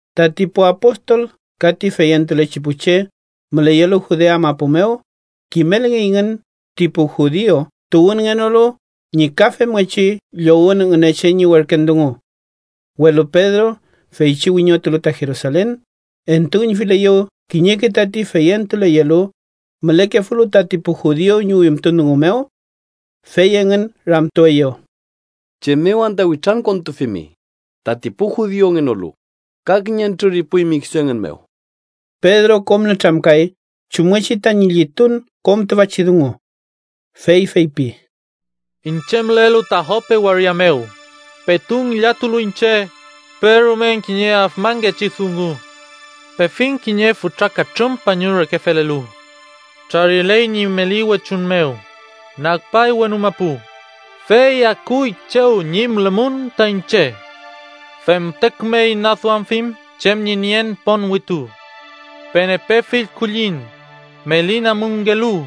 Tati pu apostol ka ti feyentulechi pu che müleyelu Judea mapu mew kimelngeyngün ti pu judiu tuwünngenolu ñi ka femngechi llowün Ngünechen ñi werken dungu. Welu Pedro, feychi wiñotulu ta Jerusalen, entuüñfileyew kiñeke tati feyentuleyelu mülekefulu tati pu judiu ñi wimtun dungu mew. Fey engün ramtueyew: —¿Chem mew anta witrankontufimi tati pu judiu tuwünngenolu ka kiñentrür ipuymi kisu engün mew? Pedro kom nütramkay chumngechi tañi llitun kom tüfachi dungu. Fey feypi: —Iñche mülelu ta Jope waria mew, petu ngillatulu iñche, perumen kiñe afmanngechi dungu. Pefiñ kiñe fütra katrün pañu reke felelu. Trariley ñi meli wechuñ mew, nagpay wenu mapu, fey akuy chew ñi mülemum ta iñche. Fente küme inaduamfiñ chem ñi nien ponwitu. Pen epe fill kulliñ meli namunngelu,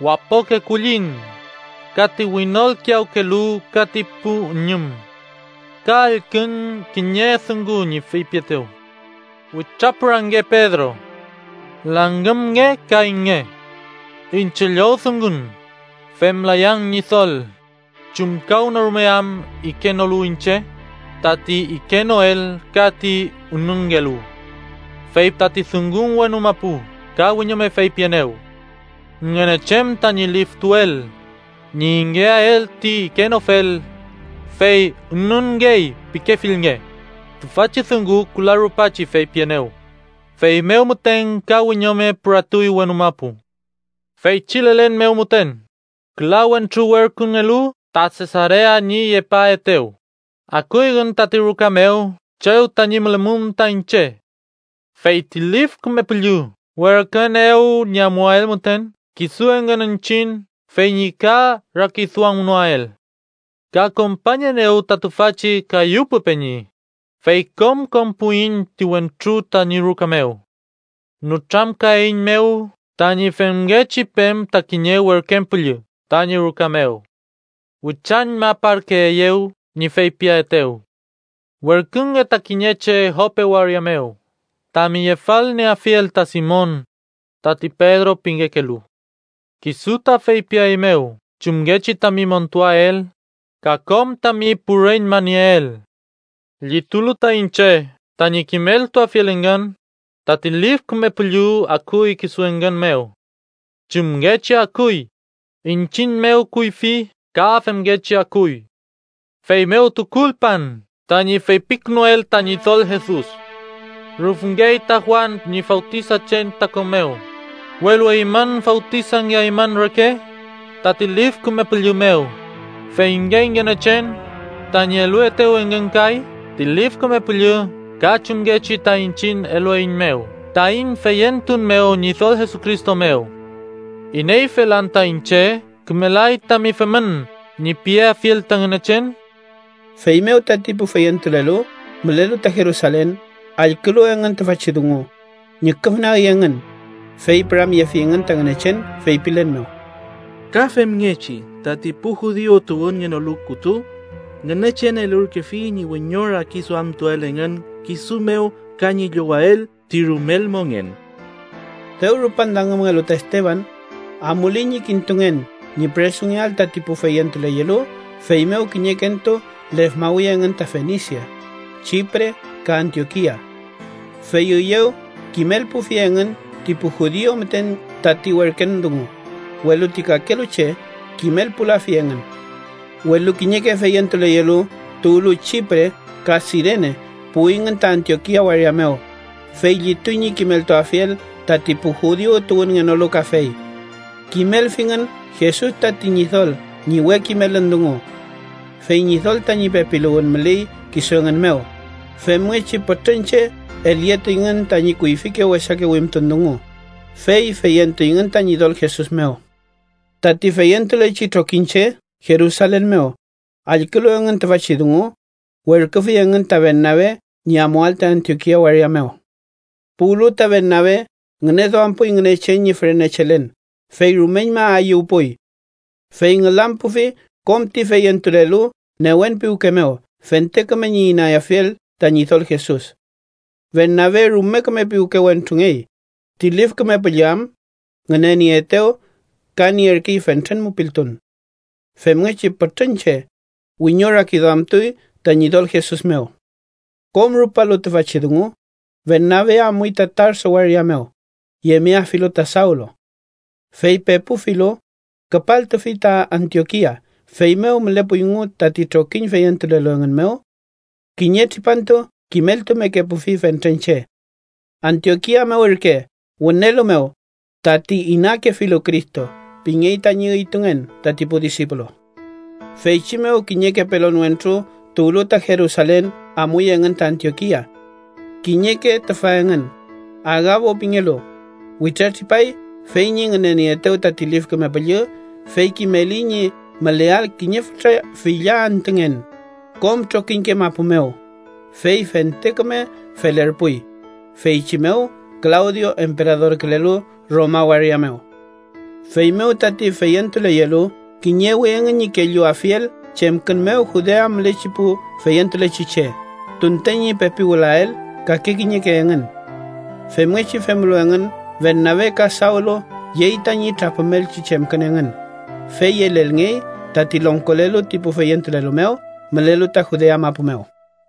wapoke kulliñ, ka ti winolkiyawkelu ka ti pu üñüm. Ka allkün kiñe dungun ñi feypietew: ‘Witrapürange, Pedro. Langümnge ka inge.’ Iñche llowdungun: ‘Femlayan Ñidol, chumkawnorume am ikenolu iñche tati ikenoel ka ti ünunngelu.’ Fey tati dungun wenu mapu ka wiñome feypienew: ‘Ngünechen tañi liftuel ñi ingeael ti ikenofel, fey ünunngey pikefilnge.’ Tüfachi dungu küla rupachi feypienew, feymew müten ka wiñome püratuy wenu mapu. “Feychi lelen mew müten, küla wentru werküngelu ta Sesarea ñi yepaaetew, akuyngün tati ruka mew chew tañi mülemum ta iñche. Fey ti Lif Küme Püllü werküenew ñi amuael müten kisu engün iñchiñ fey ñi ka rakiduamnoael. Ka kompañenew ta tüfachi kayu pu peñi, fey kom konpuiñ ti wentru tañi ruka mew. Nütramkaeiñmew tañi femngechi pen ta kiñe werken püllü tañi ruka mew. Witrañmaparkeeyew ñi feypiaetew: ‘Werkünge ta kiñeke che Jope waria mew tami yefalmeafiel ta Simon, tati Pedro pingekelu. Kisu ta feypiaeymew chumngechi tami montuael, ka kom tami pu reñma nieel.’ “Llitulu ta iñche tañi kimeltuafiel engün, tati Lif Küme Püllü akuy kisu engün mew. Chumngechi akuy iñchiñ mew kuyfi, ka femngechi akuy. Feymew tukulpan tañi feypikünuel ta Ñidol Jesus: ‘Rüfngey ta Juan ñi fawtisachen ta ko mew, welu eymün fawtisangeaymün reke tati Lif Küme Püllü mew.’ Feyngey Ngünechen tañi eluetew engün kay ti Lif Küme Püllü ka chumngechi ta iñchiñ elueiñmew taiñ feyentun mew Ñidol Jesucristo mew, ¿ineyfel anta iñche ‘kümelay tami femün’ ñi piafiel ta Ngünechen?” Feymew tati pu feyentulelu mülelu ta Jerusalen, allkülu engün tüfachi dungu, ñüküfnagi engün, fey püramyefingün ta Ngünechen, feypilen mew: —¡Ka femngechi tati pu judiu tuwünngenolu kütu Ngünechen elurkefi ñi wiñorakiduamtuael engün kisu mew ka ñi llowael ti rumel mongen! Dew rupan langümngelu ta Esteban, amuley ñi kintungen ñi püresungeael tati pu feyentuleyelu, feymew kiñekentu lefmawi engün ta Fenisia, Chipre ka Antiokia. Fey üyew kimelpufi engün ti pu judiu müten tati werken dungu, welu ti kakelu che kimelpulafi engün. Welu kiñeke feyentuleyelu tuwlu Chipre ka Sirene puwingün ta Antiokia waria mew, fey llituy ñi kimeltuafiel tati pu judiu tuwünngenolu kafey. Kimelfingün Jesus tati Ñidol ñi we kimelün dungu. Fey Ñidol tañi pepiluwün müley kisu engün mew, femngechi pütrün che elyetuyngün tañi kuyfike wesake wimtun dungu, fey feyentuyngün ta Ñidol Jesus mew. Tati feyentulechi trokiñche Jerusalen mew, allkülu engün tüfachi dungu, werküfi engün ta Bernabe ñi amuael ta Antiokia waria mew. Puwlu ta Bernabe, ngüneduampuy Ngünechen ñi fürenechelen, fey rumeñma ayüwpuy. Fey ngülampufi kom ti feyentulelu newen piwke mew fente küme ñi inayafiel ta Ñidol Jesus. Bernabe rume küme piwke wentrungey ti Lif Küme Püllü am ngünenierkeetew ka nierkey fentren mupiltun. Femngechi pütrün che wiñorakiduamtuy ta Ñidol Jesus mew. Kom rupalu tüfachi dungu, Bernabe amuy ta Tarso waria mew, yemeafilu ta Sawlu. Fey pepufilu, küpaltufi ta Antiokia. Feymew mülepuyngu tati trokiñ feyentulelu engün mew. Kiñe tripantu kimeltumekepufi fentren che. Antiokia mew ürke wünelu mew “tati inakefilu Cristo” pingey tañi üytungen tati pu disipulo. Feychi mew, kiñeke pelon wentru tuwlu ta Jerusalen, amuy engün ta Antiokia. Kiñeke tüfa engün, Agabo pingelu, witratripay fey ñi ngünenieetew tati Lif Küme Püllü, fey kimeli ñi müleael kiñe fütra filla antüngen kom trokiñke mapu mew. (Fey fente küme felerpuy, feychi mew Klawdio emperadorkülelu Roma waria mew.) Feymew tati feyentuleyelu kiñewi engün ñi kelluafiel chemkün mew Judea mülechi pu feyentulechi che, tunten ñi pepi wülael kake kiñeke engün. Femngechi femlu engün, Bernabe ka Sawlu yey tañi trapümelchi chemkün engün, fey yelelngey tati longkolelu ti pu feyentulelu mew mülelu ta Judea mapu mew.